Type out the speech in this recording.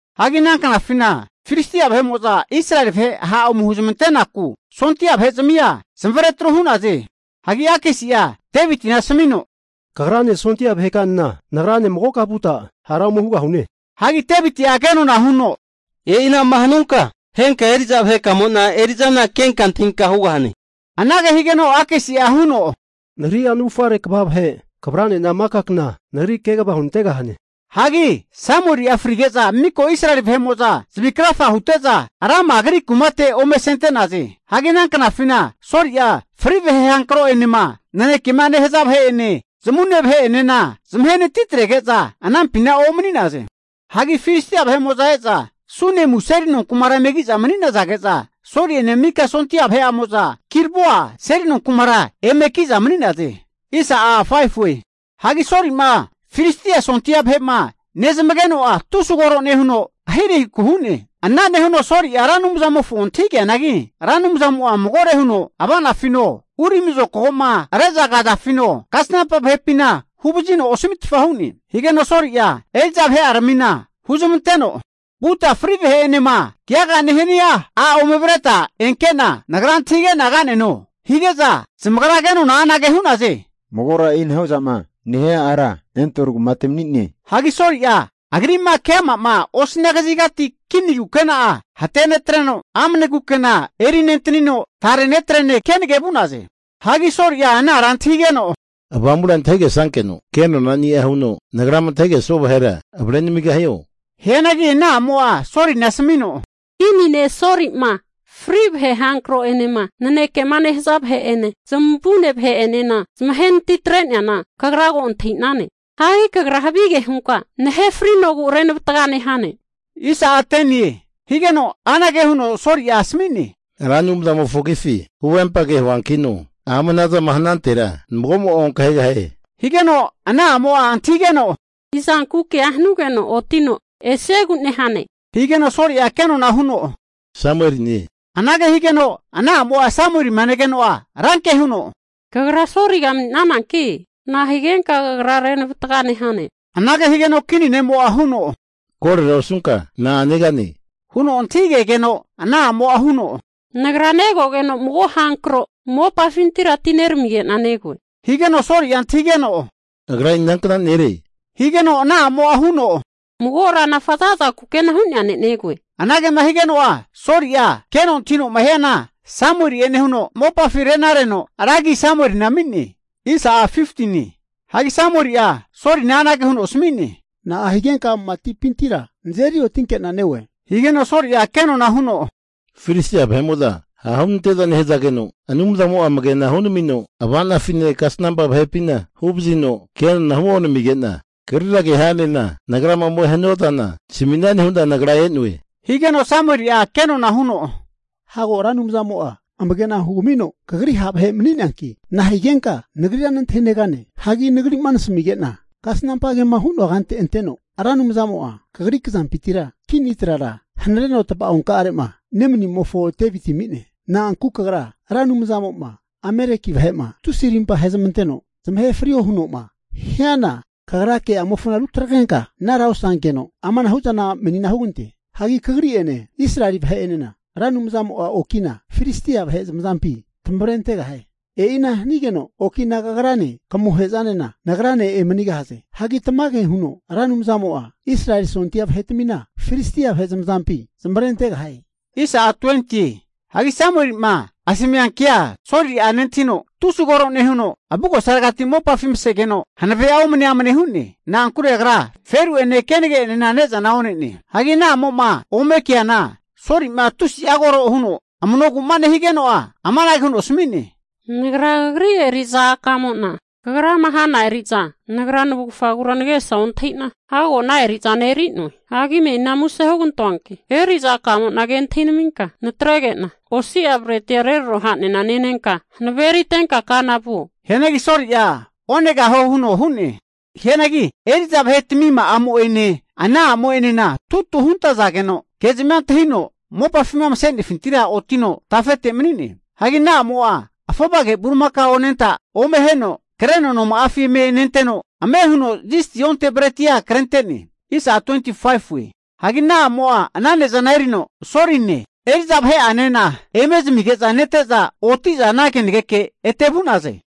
Hagi ana knafina Filistia vahe'mo'za Israeli vahe ha' ome huzamante'naku sondia vahe zamia zamavare atru hu'naze. Hagi Akisi'a Devitina asamino, Kagrane sondia vahekanena nagrane magoka vuta hara ome hugahane. Hagi Deviti'a kenona huno, E'ina'ma hanunka henka eri'za vahekamo'na eri'zana kenka antahinka hugahane. Anage higeno Akisi'a huno, Nagrani'a navufare kva vahe kavrane'na maka kna nagri kegava hunantegahane. Hagi Samueli'a frige'za miko Israeli vahe'mo'za zavi krafa hute'za, Rama agri kumate ome asente'naze. Hagi ana knafina Soli'a fri vahe hankro'enema nanekema nehaza vahe'ene zamavune vahe'enena zamahenatitrege'za anampina omani'naze. Hagi Filistia vahe'mo'za eza Sunemu seli nonkumara eme ki'za manizage'za, Soli'ene mika sondia vahe'amo'za Gilboa seli nonkumara eme ki'za mani'naze. Hagi Soli'ma Filistia sondia vahe'ma nezmageno'a tusi koro nehuno ahirahiku hu'ne. Ana nehuno Soli'a Ra Anumzamofo antahige'neanagi Ra Anumzamo'a magore huno ava'nafino, urimi zokago'ma rezagafino, kasnampa vahepina huvazino osamitfa hu'ne. Higeno Soli'a eri'za vahe'aramina huzamanteno, Vuta fri vahe'enema keaga nehania a' ome avreta enke'na, nagra antahige'na ka'neno. Hige'za zamagra kenona anage hu'naze, Magora e'inahu'zama nehia ara Endor kumate mani'ne. Hagi Soli'a agri'ma keama'ma osania kazigati kini kukena'a hunetreno, amane kukena eri nentanino, tare netrene kenage vu'naze. Hagi Soli'a ana ara antahigeno, Avamura antahigesankeno kenonani'a huno nagrama antahigesua vahera avrenamigahio? Hianagi ana a'mo'a Solina asamino, Kini ne' Soli'ma fri vahe hankro'enema nanekema nehaza vahe'ene zamavune vahe'enena zamahenatitre'neana kagra ko antahi'nane. Hagi kagra havige hunka nahe frinogu renavataga nehane. Higeno anage huno Soli'a asami'ne, Ra Anumzamofo agifi huvempage huankino ama anazama hanantera mago'mo'a onkahegahie. Higeno ana a'mo'a antahigeno, Izanku kea hanugeno otino esiegu nehane, higeno Soli'a kenona huno Samueline. Anage higeno ana a'mo'a Samuelima negeno'a ranke huno, Kagra Soliga mani'nananki nahigenka kagra renavataga nehane? Anage higeno kini ne'mo'a huno, Korera osunka na'a negane? Huno antahigegeno ana a'mo'a huno, nagra negogeno mago hankro mopafintira atineramige'na negoe. Higeno Soli'a antahigeno, Agra inankna nere? Higeno ana a'mo'a huno, Mago ranafa za'za kukena hu'nea ne' negoe. Anagema higeno'a Soli'a keno antahino'ma hiana Samueli'e nehuno, mopafi renareno ra agi Samuelina ami'ne. Hagi Samueli'a Solina anage huno asami'ne, Na'a higenka matipintira nazeri otinkena neoe? Higeno Soli'a kenona huno, Filistia vahe'mo'za ha' hunante'za nehazageno, Anumzamo'a amagena hunamino, ava'nafine kasnampa vahepina huvazino kenona huonamige'na, kagrira ke hanena nagrama ome hanua zana nasamisane hu'na nagra e'noe. Higeno Samueli'a kenona huno, Hago Ra Anumzamo'a amagena hugamino kagri ha' vahe mani'neanki, na'a higenka nagrira nantahinegane? Hagi nagri'ma nasamige'na kasnampa kema hu'noa kante anteno, Ra Anumzamo'a kagri kazampintira kini trara hanareno tava'onkare'ma nemanimofo Deviti ami'ne. Na'ankure kagra Ra Anumzamo'ma Ameleki vahe'ma tusi rimpa ahezmanteno, zamahe frio huno'ma hiana kagra ke'amofona rutagrenka anara osankeno, amanahu'zana menina hugante. Hagi kagri'ene Israeli vahe'enena Ra Anumzmo'a oki'na Filistia vahe zamazampi tamavrentegahie. E'ina hanigeno oki'na kagrane kamohe'zanena nagrane emanigahaze. Hagi tamage huno Ra Anumzamo'a Israeli Sondia vahetamina Filistia vahe zamazampi zamavarentegahie. Hagi Samueli'ma asamia kea Soli'a nentahino tusi kore nehuno, avugosaregati mopafi masegeno hanave'a omane amane hu'ne. Na'ankure agra feru'ene kenage enena ne'zana one'ne. Hagi ana a'mo'ma ome keana, Soli'ma tusi'a kore huno amanogu'ma nehigeno'a amanage huno asami'ne, Nagra kagri eri'za akamo'na kagrama hana eri'za nagra navufagura nagesa ontahi'na, hago ana eri'zana eri'noe. Hagi menina muse hugantoanki eri'za akamo'na ke antahinaminka natrege'na, osi'a bretika'a reraro hanena nenka hanavea eritenka kana vuo. Hianagi Soli'a onegahue huno hu'ne. Hianagi eri'za vahetamima'amo'ene ana a'mo'enena tutu huntazageno, kezmia antahino mopafima mase'nefintira otino tafete mani'ne. Hagi ana a'mo'a afovage bulimakao anenta ome aheno kreno noma'afi eme nenteno, ame huno zisti onte bretia krente'ne. Hagi ana a'mo'a ana ne'zana erino Soline eri'za vahe'anena eme zamige'za nete'za, oti'za ana kenageke ete vu'naze.